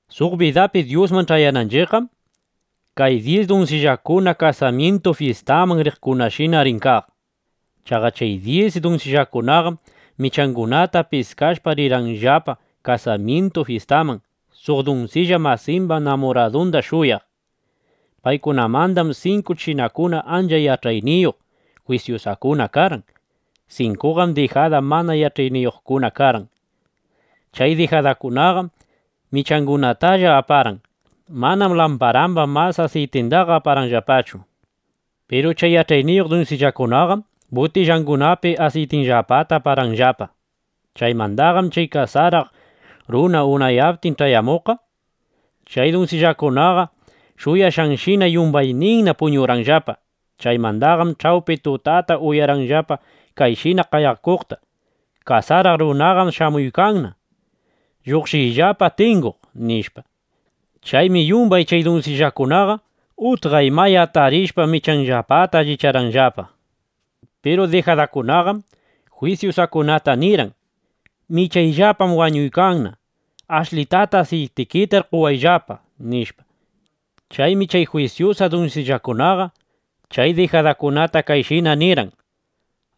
’Suq bidapi Dyusman ch'ayananchiqqam, kay dyis dunsillakuna kasamyintu fyistaman riqkunashina rin kaq. Chaqa chay dyis dunsillakunaqam michangunata piskashpa, rirqanllapa kasamyintu fyistaman, suq dunsilla masimba namuradunda shuyaq. Paykunamandam sinku chinakuna ancha yach'ayniyuq, jwisyusakuna karqan. Sinkuqam dijada mana yach'ayniyuqkuna karqan. Chay dijadakunaqam michangunatalla aparqan. Manam lamparamba mas asiytindaqa aparqanllapachu. Piru chay yach'ayniyuq dunsillakunaqam butillangunapi asiytinllapata aparqanllapa. Chaymandaqam chay kasaraq runa unayaptin ch'ayamuqqa, chay dunsillakunaqa shuyashqanshina, yumbayninna puñurqanllapa. ’Chaymandaqam ch'awpi tutata uyarqanllapa kayshina qayakuqta: “¡Kasaraq runaqam shamuykanna! ¡Lluqshiyllapa tinguq!” nishpa. Chaymi yumbay chay dunsillakunaqa utqaymaya atarishpa, michanllapata allicharqanllapa. Piru dijadakunaqam jwisyusakunata nirqan: “¡Michayllapam wañuykanna! ¡Ashlita asiytikitar qowayllapa!” nishpa. Chaymi chay jwisyusa dunsillakunaqa chay dijadakunata kayshina nirqan: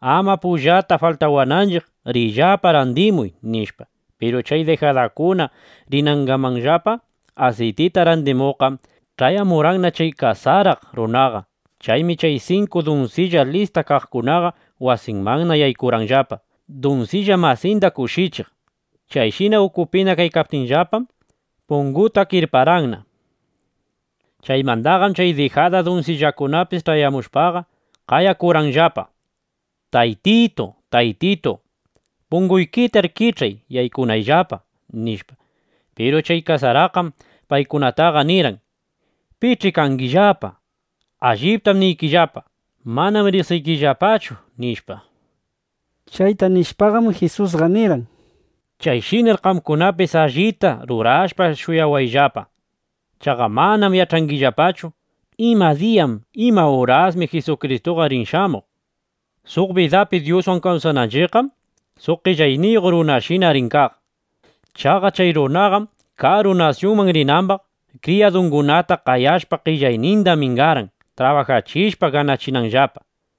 “Ama pullata faltawananchiq, riyllapa randimuy”, nishpa. Piru chay dijadakuna rinangamanllapa asiytita randimuqqam, ch'ayamurqanna chay kasaraq runaqa. Chaymi chay sinku dunsilla lista kaqkunaqa wasimanna yaykurqanllapa, dunsilla masinda kushichiq. Chayshina ukupina kaptinllapaqam, pungutaqa kirparqanna. Chaymandaqam chay dijada dunsillakunapis ch'ayamushpaqa, qayakurqanllapa: “Taytitu, Taytitu, punguykitar kich'ay yaykunayllapa”, nishpa. Piru chay kasaraqqam paykunataqa nirqan: “¿Pich'i kangillapa? Alliptam niykillapa, manam riqsiykillapachu”, nishpa. Chayta nishpaqam, Jisusqa nirqan: —Chayshinar qamkunapis allita rurashpa shuyawayllapa. Chaqa manam yach'angillapachu: Ima diya, ima urasmi Jisukristuqa rin shamuq, nishpaqa. ’Suq bidapi Dyuswan kawsananchiqqam suq qellayniyuq runashina rin kaq. Chaqa chay runaqam karu nasyunman rinambaq, kriyadungunata qayashpa, qellayninda mingarqan trabajachishpa ganachinanllapa.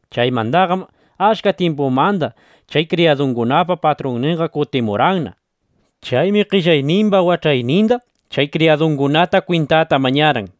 ’Chaymandaqam achka tyimpumanda chay kriyadukunapa patrunninqa kutimurqanna. Chaymi qellaynimba wach'aynimbaq chay kriyadungunata kwintata mañarqan.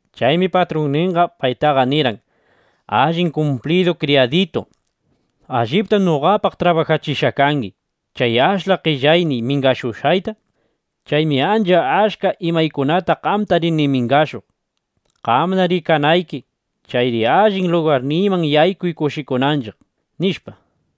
Chaymi patrunninqa paytaqa nirqan: “Allin kumplidu kriyaditu, allitam noqapaq trabajachishqa kangi chay ashla qellayniy mingashushqayta. Chaymi ancha achka imaykunata qamta rini mingashuq, qamna rikanayki. Chayri allin lugarniyman yaykuy, kushikunanchiq”, nishpa.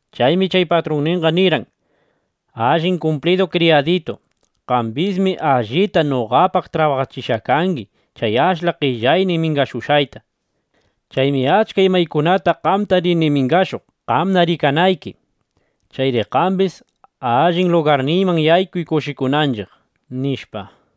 Chaymi chay patrunninqa nirqan: “Allin kumplidu kriyaditu, qambismi allita noqapaq trabajachishqa kangi chay ashla qellayniy mingashushqayta. Chaymi achka imaykunata qamta rini mingashuq, qamna rikanayki. Chayri qambis allin lugarniyman yaykuy kushikunanchiq”, nishpa.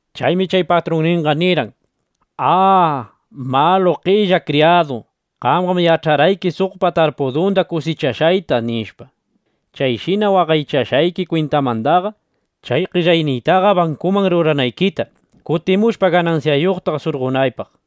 Chaymi chay patrunninqa nirqan: “¡A, malu, qella kriyadu! Qamqam yach'arqayki suqpa tarpudunda kusichashqayta, nishpa. Chayshina waqaychashqayki kwintamandaqa, chay qellayniytaqa bankuman ruranaykita, kutimushpa ganansyayuqta surqonaypaq”.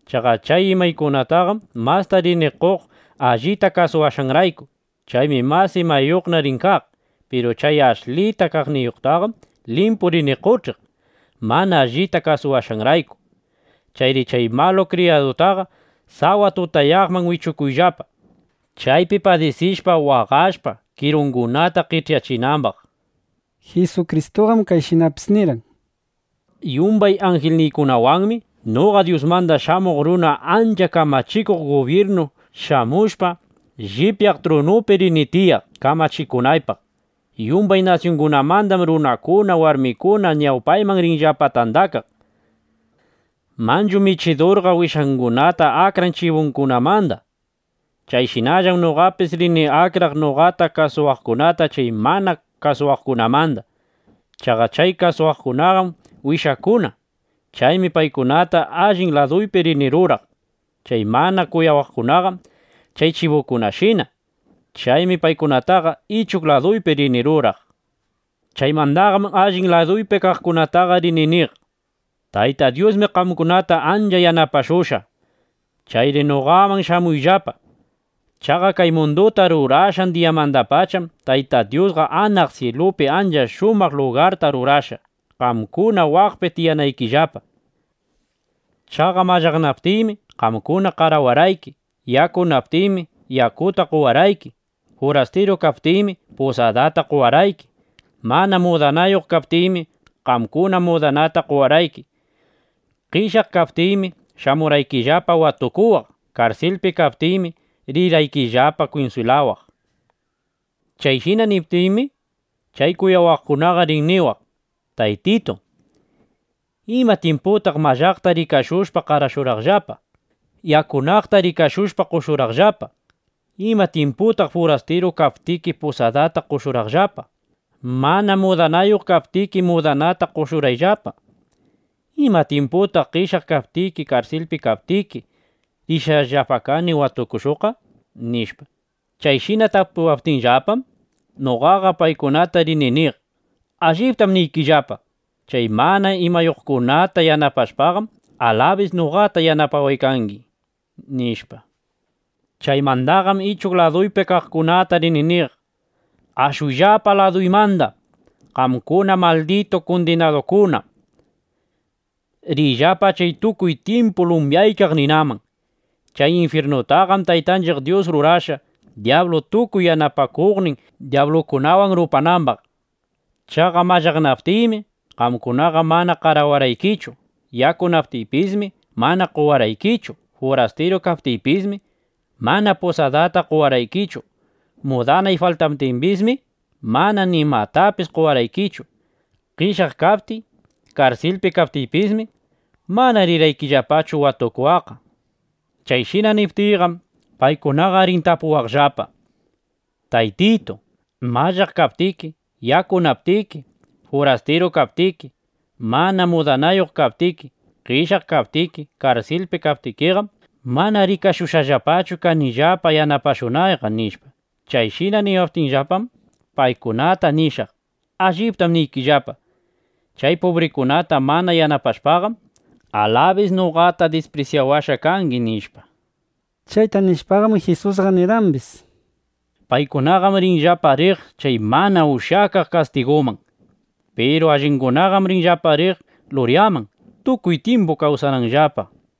Chaqa chay imayuqtaqam masta rini qoq (allita kasuwashqanrayku). Chaymi mas imayuqna rin kaq. Piru chay ashlita kaqniyuqtaqam limpu rini qoch'iq (mana allita kasuwashqanrayku). Chayri chay malu kriyadutaqa sawa tutayaqman wichukuyllapa, chaypi padisishpa, waqashpa, kirungunata qech'yachinambaq”, nishpa. Jisukristuqam kayshinapis nirqan: —Yumbay anjilniykunawanmi noqa Dyusmanda Shamuq Runa ancha kamachikuq gubyirnu shamushpa, llipyaq trunuypi rini tiyaq kamachikunaypaq. Yumbay nasyungunamandam runakuna, warmikuna ñawpayman rinllapa tandakaq. Manchu michidurqa wishangunata akran chibukunamanda. Chayshinallam noqapis rini akraq noqata kuyawaqkunata chay mana kuyawaqkunamanda. Chaqa chay kuyawaqkunaqam wishaykuna. Chaymi paykunata allin laduypi rini ruraq. Chay mana kuyawaqkunaqam chay chibukunashina. Chaymi paykunataqa ichuq laduypi rini ruraq. Chaymandaqam allin laduypi kaqkunataqa rini niq: “Tayta Dyusmi qamkunata ancha yanapashushqa. Chayri noqaman shamuyllapa. Chaqa kay munduta rurashqan diyamandapacham Tayta Dyusqa anaq syilupi ancha shumaq lugarta rurashqa, qamkuna waqpi tiyanaykillapa. Chaqa mallaqnaptiymi, qamkuna qarawarqayki. Yakunaptiymi, yakuta qowarqayki. Furastiru kaptiymi, pusadata qowarqayki. Mana mudanayuq kaptiymi, qamkuna mudanata qowarqayki. Qeshyaq kaptiymi, shamurqaykillapa watukuwaq. Karsilpi kaptiypismi, rirqaykillapa kunswilawaq”. Chayshina niptiymi, chay kuyawaqkunaqa rin niwaq: “Taytitu, ¿ima tyimputaq mallaqta rikashushpa, qarashurqaqllapa, yakunaqta rikashushpa, qoshurqaqllapaqa? ¿Ima tyimputaq furastiru kaptiki, pusadata qoshurqaqllapa, mana mudanayuq kaptiki, mudanata qoshurqaqllapa? ¿Ima tyimputaq qeshyaq kaptiki, karsilpi kaptiki, rirqayllapa watukushuqqa?” nishpa. Chayshina tapuwaptinllapam, noqaqa paykunata rini niq: “Alliptam niykillapa, chay mana imayuqkunata yanapashpaqam, alabis noqata yanapawashqa kangi”, nishpa. ’Chaymandaqam ichuq laduypi kaqkunatana rini niq: “¡Ashuyllapa laduymanda qamkuna malditu kundinadukuna! Riyllapa chay tukuy tyimpu lumyaykaq ninaman. Chay infyirnutaqam Taytanchiq Dyus rurashqa, dyablu tukuy yanapakuqnin dyablukunawan rupanambaq. Chaqa mallaqnaptiymi, qamkunaqa mana qarawarqaykichu; yakunaptiypismi, mana qowarqaykichu. Furastiru kaptiypismi, mana pusadata qowarqaykichu. Mudanay faltawaptimbismi, mana nimatapis qowarqaykichu. Qeshyaq kaptiy, karsilpi kaptiypismi, mana rirqaykillapachu watukuwaqqa”. Chayshina niptiyqam, paykunaqa rin tapuwaqllapa: “Taytitu, mallaq kaptiki, yakunaptiki, furastiru kaptiki, mana mudanayuq kaptiki, qeshyaq kaptiki, karsilpi kaptikiqam, mana rikashushqachu kanillapa yanapashunayqa”, nishpa. Chayshina niwaptinllapaqam, paykunata nishaq: “Alliptam niykillapa, chay pubrikunata mana yanapashpaqam, alabis noqata disprisyawashqa kangi”, nishpa. Chayta nishpaqam, Jisusqa nirqambis: —Paykunaqam rinllapa riq chay mana ushyakaq kastiguman. Piru allingunaqam rinllapa riq luryaman, tukuy tyimpu kawsananllapa, nishpa.